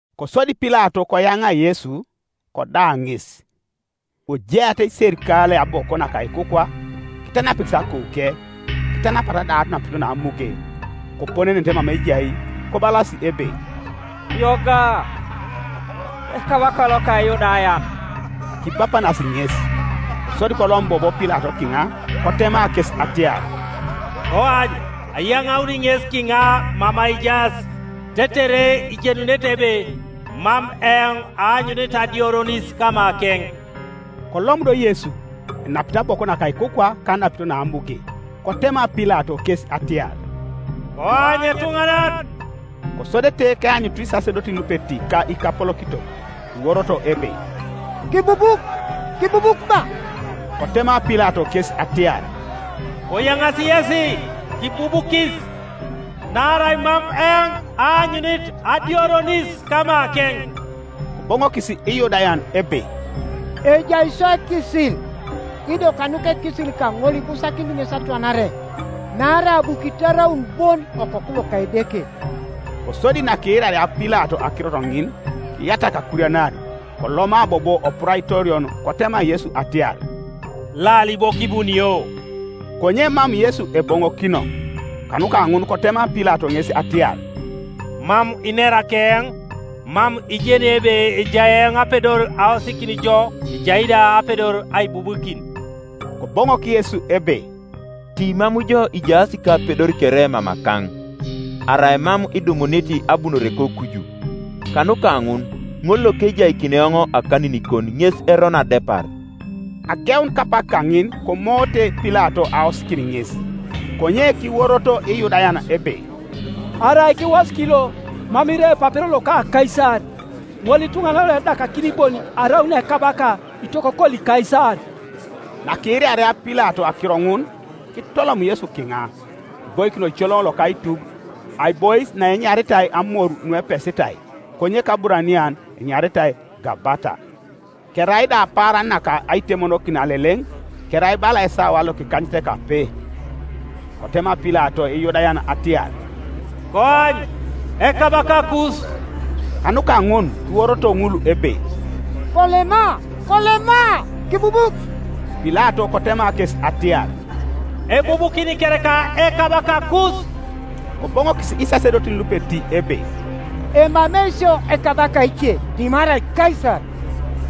Kosodi Pilato koyaŋa Yesu, koda ŋes. Kojeata iserikalei aboko naka ikukwa, kitanapikis akouke, kitanapata da anapito naamuge; koponenenete mama ejai, kobalas ebe, “Yoga, Ekabaka loka Iyudayan!” Kibapanasi ŋes. Kosodi kolom bobo Pilato kiŋa, kotema kes atiar, “Koany ayaŋauni ŋes kiŋa mama ijaas, tetere ijenunete ebe mam eoŋ aanyunit adioronis kamakeŋ.” Kolom do Yesu, enapit aboko naka ikukwa ka anapito naamuge, Kotema Pilato kes atiar, “Koany etuŋanan!” Kosodete keanyutu isasedotin lupeti ka ikapolokitok, kiworoto ebe, “Kibubuk, kibubuk ba!” Kotema Pilato kes atiar, “Koyaŋaasi yesi, kibubukis, naarai mam eoŋ aanyunit adioronis kamakeŋ.” Koboŋokis Iyudayan ebe, “Ejai sio ekisil, ido kanuka ekisil kaŋol ibusakinit ŋes atwanare, naarai abu kitarauna bon Okoku loka Edeke.” Kosodi nakiiraria Pilato akirot ŋin, kiyatak akurianar; koloma bobo oPuraitorion kotema Yesu atiar, “Laali bo kibunio?” Konye mam Yesu eboŋokino. Kanuka ŋun kotema Pilato ŋes atiar, “Mam inera keoŋ? Mam ijeni ebe ejai eoŋ apedor aosikin jo, ejai da apedor aibubukin?” Koboŋok Yesu ebe, “Ti mam jo ijaas kapedor kere mamakaŋ, arai mam kidumunit abunore kokuju; kanuka ŋun ŋol lokejaikini eoŋ akaninikon ŋes erono adepar.” Ageun kapak kaŋin komoote Pilato aosikin ŋes, konye kiworoto Iyudayan ebe, “Arai kiwosik lo, mam irai epapero loka Kaisar; ŋolituŋanan loedakakini bon araun ekabaka itokokoli Kaisar.” Nakiiraria Pilato akiro ŋun, kitolom Yesu kiŋa, kiboikin oicoloŋ loka aitub, aibois naenyaritai Amor Nuepesitai, konye kAburanian enyaritai Gabata. Kerai da apaaran naka Aitemokin Aleleŋ; kerai bala esawa lokikanyetekape. Kotema Pilato Iyudayan atiar, “Koany, Ekabakakus!” Kanuka ŋun kiworoto ŋul ebe, “Kolema, kolema, kibubuk!” Pilato kotema kes atiar, “Ebubukini kereka Ekabakakus?” Koboŋokis isasedotin lupeti ebe, “Emamei sio ekabaka ece dimarai Kaisar.”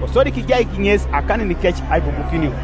Kosodi kijaik ŋes akaninikec aibubukinio.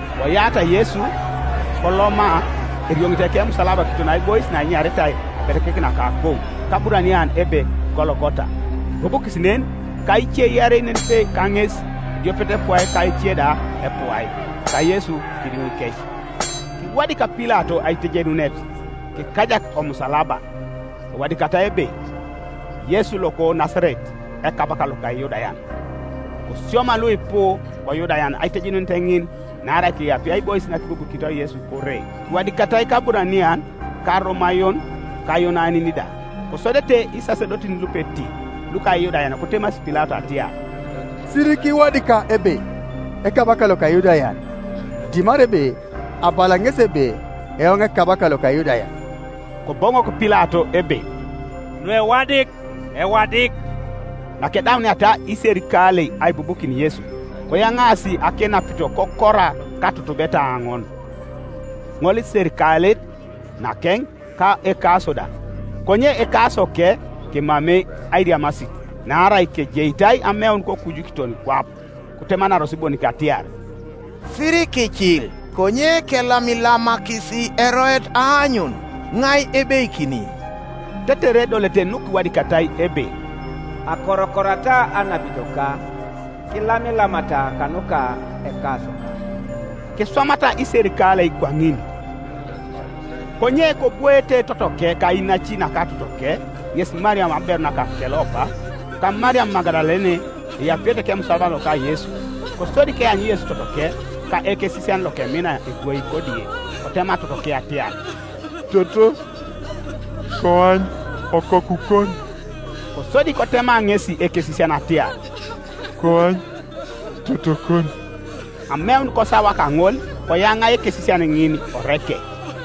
Koyata Yesu, koloma, erioŋit ekemusalaba kiton aibois naenyaritai Abelekek naka Akou, kAburanian ebe Gologota. Kibubukis nen, ka ice iarei nenipe kaŋes, ediopet epuai ka ece da epuai, ka Yesu kidiŋikec. Kiwadik Pilato aitejenunet, kikajak omusalaba; ewadikatai ebe, “YESU LOKO NASARET, EKABAKA LOKA IYUDAYAN.” Kosioma luipu koYudayan aitejenunet ŋin, naarai keapie aibois nakibubukinitoi Yesu kore; kiwadikatai kAburanian, ka Aromayon, ka Ayonanin da. Kosodete isasedotin lupeti luka Iyudayan kotemasi Pilato atiar, “Sirikiwadika ebe, ‘Ekabaka loka lyudayan’, dimarai ebe, ‘Abala ŋesi ebe Eoŋ ekabaka loka Iyudayan.’” Koboŋok Pilato ebe, “Nuewadik, ewadik.” Nakedauniata iserikalei aibubukin Yesu, koyaŋaasi akenapito kokora katutubeta aoŋon, ŋoliserikalet nakeŋ, ka ekaso da. Konye ekasoke kemamei airiamasit, naarai kejeitai ameun kokuju kiton kwap; Kotemanaros bonik atiar, “Sirikiicil, konye kelamilamakisi eroet aanyun iŋai ebeikini.” Tetere edolete nukiwadikatai ebe, “Akorokorata anapitoka, Kilamilamata kanuka ekasoka.” Kiswamata iserikalei kwaŋin. Konye kobwoete totoke ka inaci naka totoke, ŋes Mariam aberu naka Kelopa, ka Mariam Magadalene, eapiete kemusalaba loka Yesu. Kosodi keanyu Yesu totoke, ka ekesisian lokemina ebwoi kodie, kotema totoke atiar, “Toto, koany okokukon!” Kosodi kotema ŋesi ekesisian atiar, “Koany totokon!” Ameun kosawa kaŋol koyaŋa ekesisian ŋin oreke.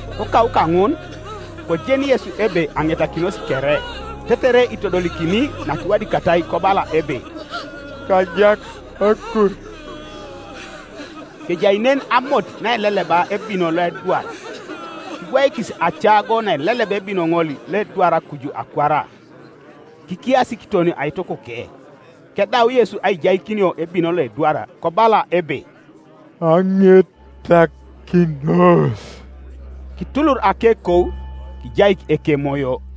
Kokau kaŋun, kojeni Yesu ebe aŋetakinos kere, tetere itodolikini nakiwadikatai kobala ebe, “Kajak akur.” Kejai nen amot naeleleba ebino loedwar; kibwaikis acago naileleba ebino ŋol loedwar kuju akwara, kikiasi kiton aitukuke. Kedau Yesu aijaikinio ebino loedwar, kobala ebe, “Aŋetakinos.” Kitulur akekou, kijaik ekemoyo.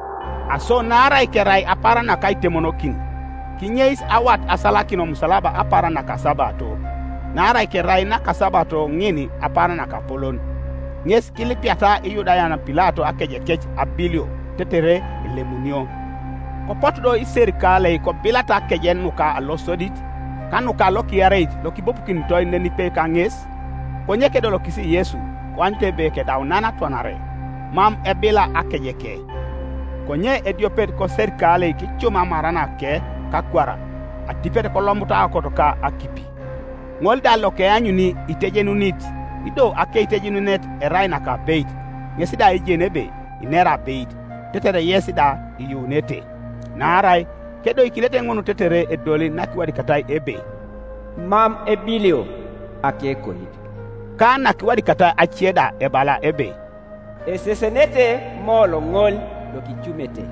Aso naarai kerai apaaran naka Aitemonokin, kinyeis awat asalakin omusalaba apaaran nakasabato (naarai kerai nakasabato ŋin apaaran nakapolon), ŋes kilipiata Iyudayan Pilato akejekec abilio, tetere elemunio. Kopotu do iserikalei kobilata akeje nuka losodit, ka nuka lokiareit lokibubukinitoi nenipe kaŋes; konye kedolokis Yesu koanyut ebe kedau nan atwanare, mam ebila akejeke, Konye ediopet koserikalei kicum amaranake kakwara, atipet kolomutu aokot ka akipi. Ŋol da lokeanyuni itejenunit, ido akeitejenunet erai nakabeit, ŋes da ejeni ebe inera abeit, tetere yes da iyuunete. Naarai kedoikinete ŋun tetere edoli nakiwadikatai ebe, “Mam ebilio akekoit.” Ka nakiwadikatai ace da ebala ebe, “Esesenete moolo ŋol lokicumete.”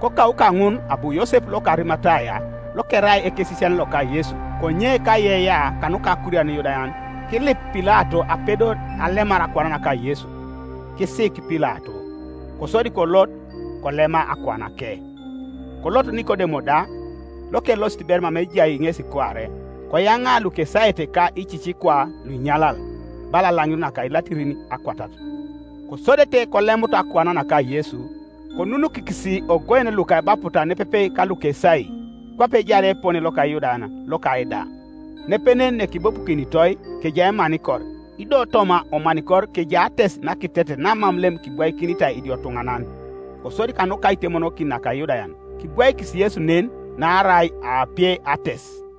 Kokau kaŋun abu Yosep loka Arimataya lokerai ekesisian loka Yesu, konye kaiyeiyea kanuka akurian Iyudayan, kilip Pilato apedor alemar akuan naka Yesu: kisiik Pilato. Kosodi kolot, kolema akuanake. Kolot Nikodemo da, lokelosit ber mama ejai ŋesi kuare, koyaŋa lukesaete ka icicikwa luinyalal, bala alaŋir naka ilatirin akwatat. Kosodete kolemut akuan naka Yesu, konunukikis ogoen luka ebaputa nepepe kalukesai, kwape ejaar epone loka Iyudayan loka aida. Nepenen nekibubukinitoi kejai emanikor; ido toma omanikor kejai ates nakitetet namam lem kibwaikinitai idiotuŋanan. Kosodi kanuka Aitemonokin naka Iyudayan, kibwaikis Yesu nen, naarai aapie ates.